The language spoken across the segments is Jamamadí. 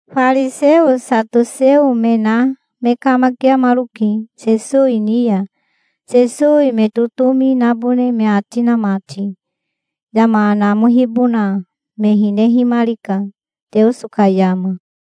Fariseo satoseo me na me kamakiamaroke Sesowi ni ya, Sesowi me totomi nabone me ati na mati. Yama namohibona me hinehimarika, Teoso ka yama.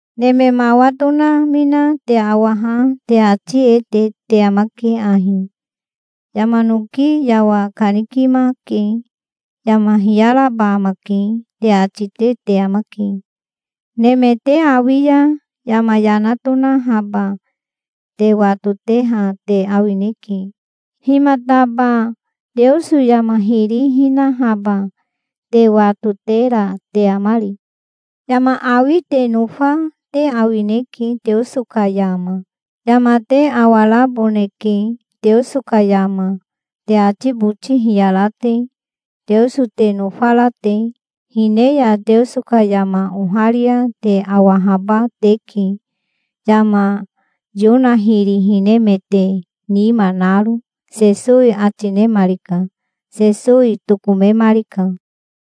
Neme mawa tonamina te awaha te ati e te te amake ahi: 'Yama noki yawa kanikimake. Yama hiyaraba amake', te ati te te amake. Neme te awi ya yama yana tonahaba te watoteha te awineke. Himataba Teoso yama hiri hinahaba te watotera te amari? Yama awi te nofa te awineke Teoso ka yama. Yama te awaraboneke Teoso ka yama, te ati boti hiyara te, Teoso te nofara te. Hine ya Teoso ka yama oharia te awahaba teke, yama Yona hiri hinemete nima naro", Sesowi ati nemarika. Sesowi tokomemarika.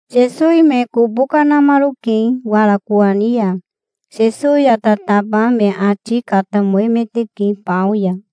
Sesowi me kobo kanamaroke wara kowani ya. Sesowi ya tataba me ati katamoemeteke bao ya.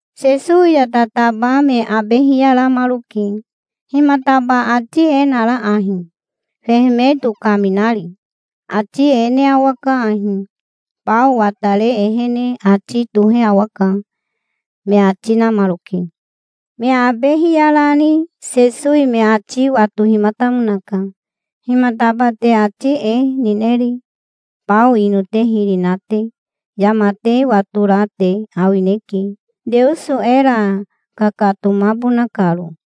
Sesowi ya tataba me abe hiyaramaroke. "Himataba ati e nara ahi, fehemeto kaminari? Ati e ne awaka ahi: Bao watare ehene ati tohe awaka", me ati namaroke. Me abe hiyarani Sesowi me ati watohimatamonaka. "Himataba te ati e nineri, bao ino te hiri na te? Yama te watora te awineke, Teoso era kakatomabona karo.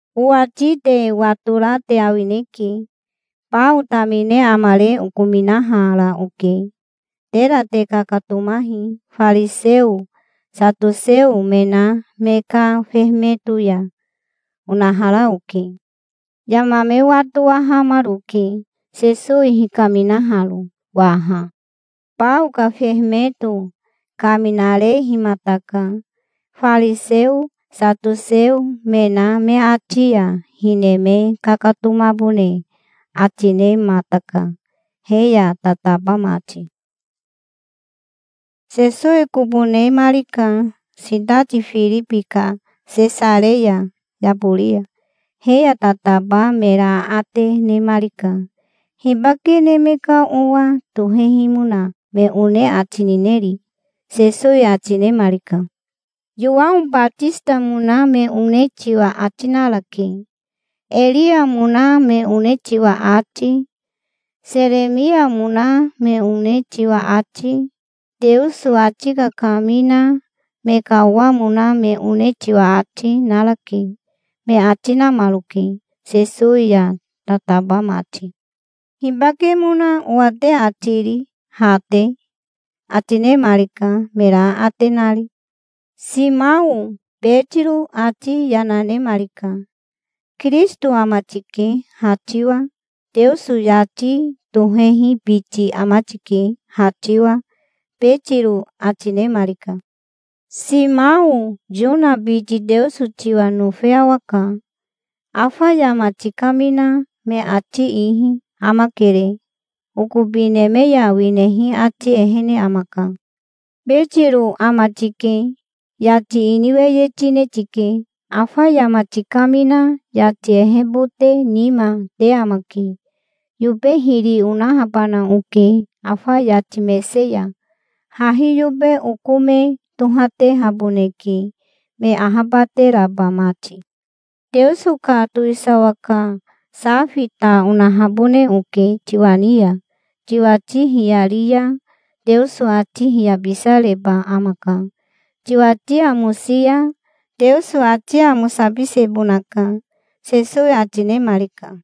Owati te watora te awineke. Bao tamine amare okominahara oke. Tera te kakatomahi fariseo satoseo me na me ka fehemeto ya, onahara oke". Yama me watowahamaroke, Sesowi hikaminaharo waha. Bao ka fehemeto kaminarehimataka. Fariseo satoseo me na me ati ya hine me kakatomabone ati nemataka he ya tataba mati. Sesowi kobo nemarika sitati Firibi ka Sesareya yabori ya. He ya tataba mera aate nemarika. "Hibake Neme ka Owa tohehimona me one ati nineri?" Sesowi ati nemarika. "Yowao Batisitamona me one tiwa ati narake. Eriamona me one tiwa ati, Seremiamona me one tiwa ati, Teoso ati kakamina me ka owamona me one tiwa ati, narake", me ati namaroke, Sesowi ya tataba mati. "Hibakemona owa te ati ri, ha te?" ati nemarika, mera aate nari. Simao Betiro ati yana nemarika. "Kirisito ama tike ha tiwa. Teoso yati tohehi biti ama tike ha tiwa", Betiro ati nemarika. "Simao Yona biti Teoso tiwa nofe awaka. Afa yama tikamina me ati ihi amakere. Okobi neme ya winehi ati ehene amaka. Betiro ama tike. Yati ini weye tine tike. Afa yama tikamina yati ehebote nima te amake. Yobe hiri onahabana oke afa yati mese ya. Hahi yobe oko me tohatehaboneke, me ahabateraba mati. Teoso ka towisawa ka safi ta onahabone oke tiwa ni ya. Tiwati hiyari ya Teoso ati hiyabisareba amaka. Tiwati amosi ya Teoso ati amosabisebonaka", Sesowi ati nemarika.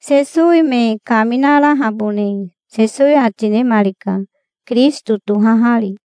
Sesowi me kaminarahabone Sesowi ati nemarika Kirisito tohahari.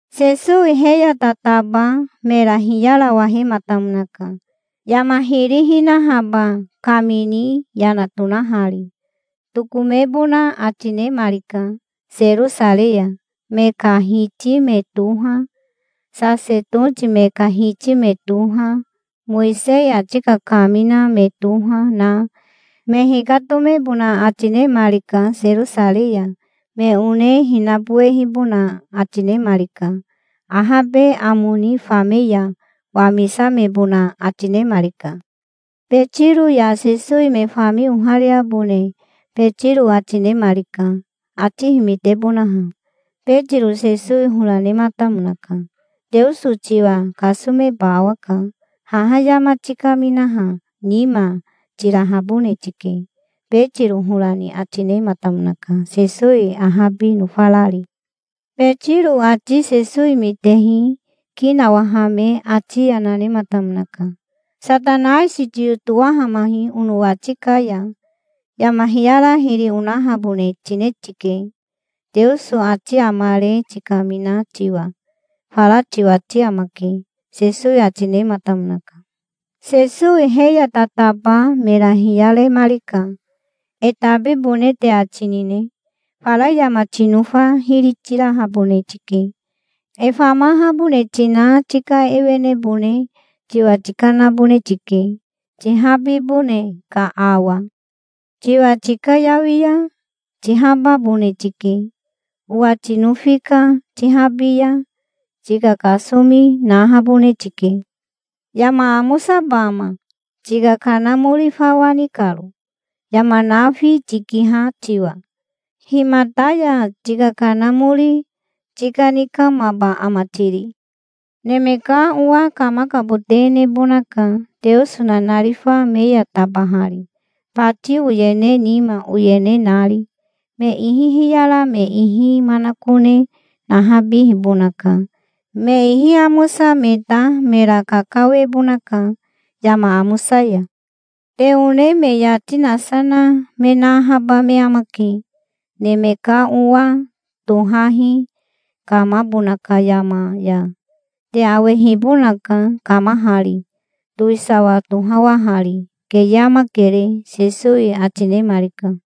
Sesowi he ya tataba mera hiyarawahematamonaka, yama hiri hinahaba kamini yana tonahari. Tokomebona ati nemarika Serosarei ya. Me ka hiti me toha, sasetoti me ka hiti me toha, Mowisei ati kakamina me toha, na me hikatomebona ati nemarika Serosarei ya. Me one hinabowehibona ati nemarika. Ahabe amo ni fame ya wamisamebona ati nemarika. Betiro ya Sesowi me fami ohariabone Betiro ati nemarika, ati himitebonaha. Betiro Sesowi hora nematamonaka. "Teoso tiwa kasomeba awaka. Haha yama tikaminaha nima tirahabone tike", Betiro hora ni ati nematamonaka, Sesowi ahabi nofarari. Betiro ati Sesowi mitehi ki nawahame ati yana nematamonaka. "Satanaisi tiyotowamahi onowati ka ya. Yama hiyara hiri onahabone tine tike, Teoso ati amare tikamina tiwa. Fara tiwati amake", Sesowi ati nematamonaka. Sesowi he ya tataba mera hiyaremarika. "E tabibone te ati nine? Fara yama tinofa hiri tirahabone tike. E famahabone tina tika ewenebone tiwa tikanabone tike, tihabibone ka awa. Tiwa tikayawi ya tihababone tike. Owa tinofi ka tihabi ya tika kasomi nahabone tike. Yama amosaba ama, tika kanamori fawa ni karo, yama nafi tikiha tiwa? Himata ya tika kanamori tikanikamaba ama tiri? Neme ka Owa kamakabote nebonaka Teoso nanarifa me ya tabahari, bati oyene nima oyene nari. Me ihi hiyara me ihi manakone nahabibonaka. Me ihi amosa me ta mera kakawebonaka yama amosa ya. Te one me yati nasa na me nahaba me amake, Neme ka Owa tohahi kamabona ka yama ya. Te awehibonaka kamahari, towisawa tohawahari. Keye amakere", Sesowi ati nemarika.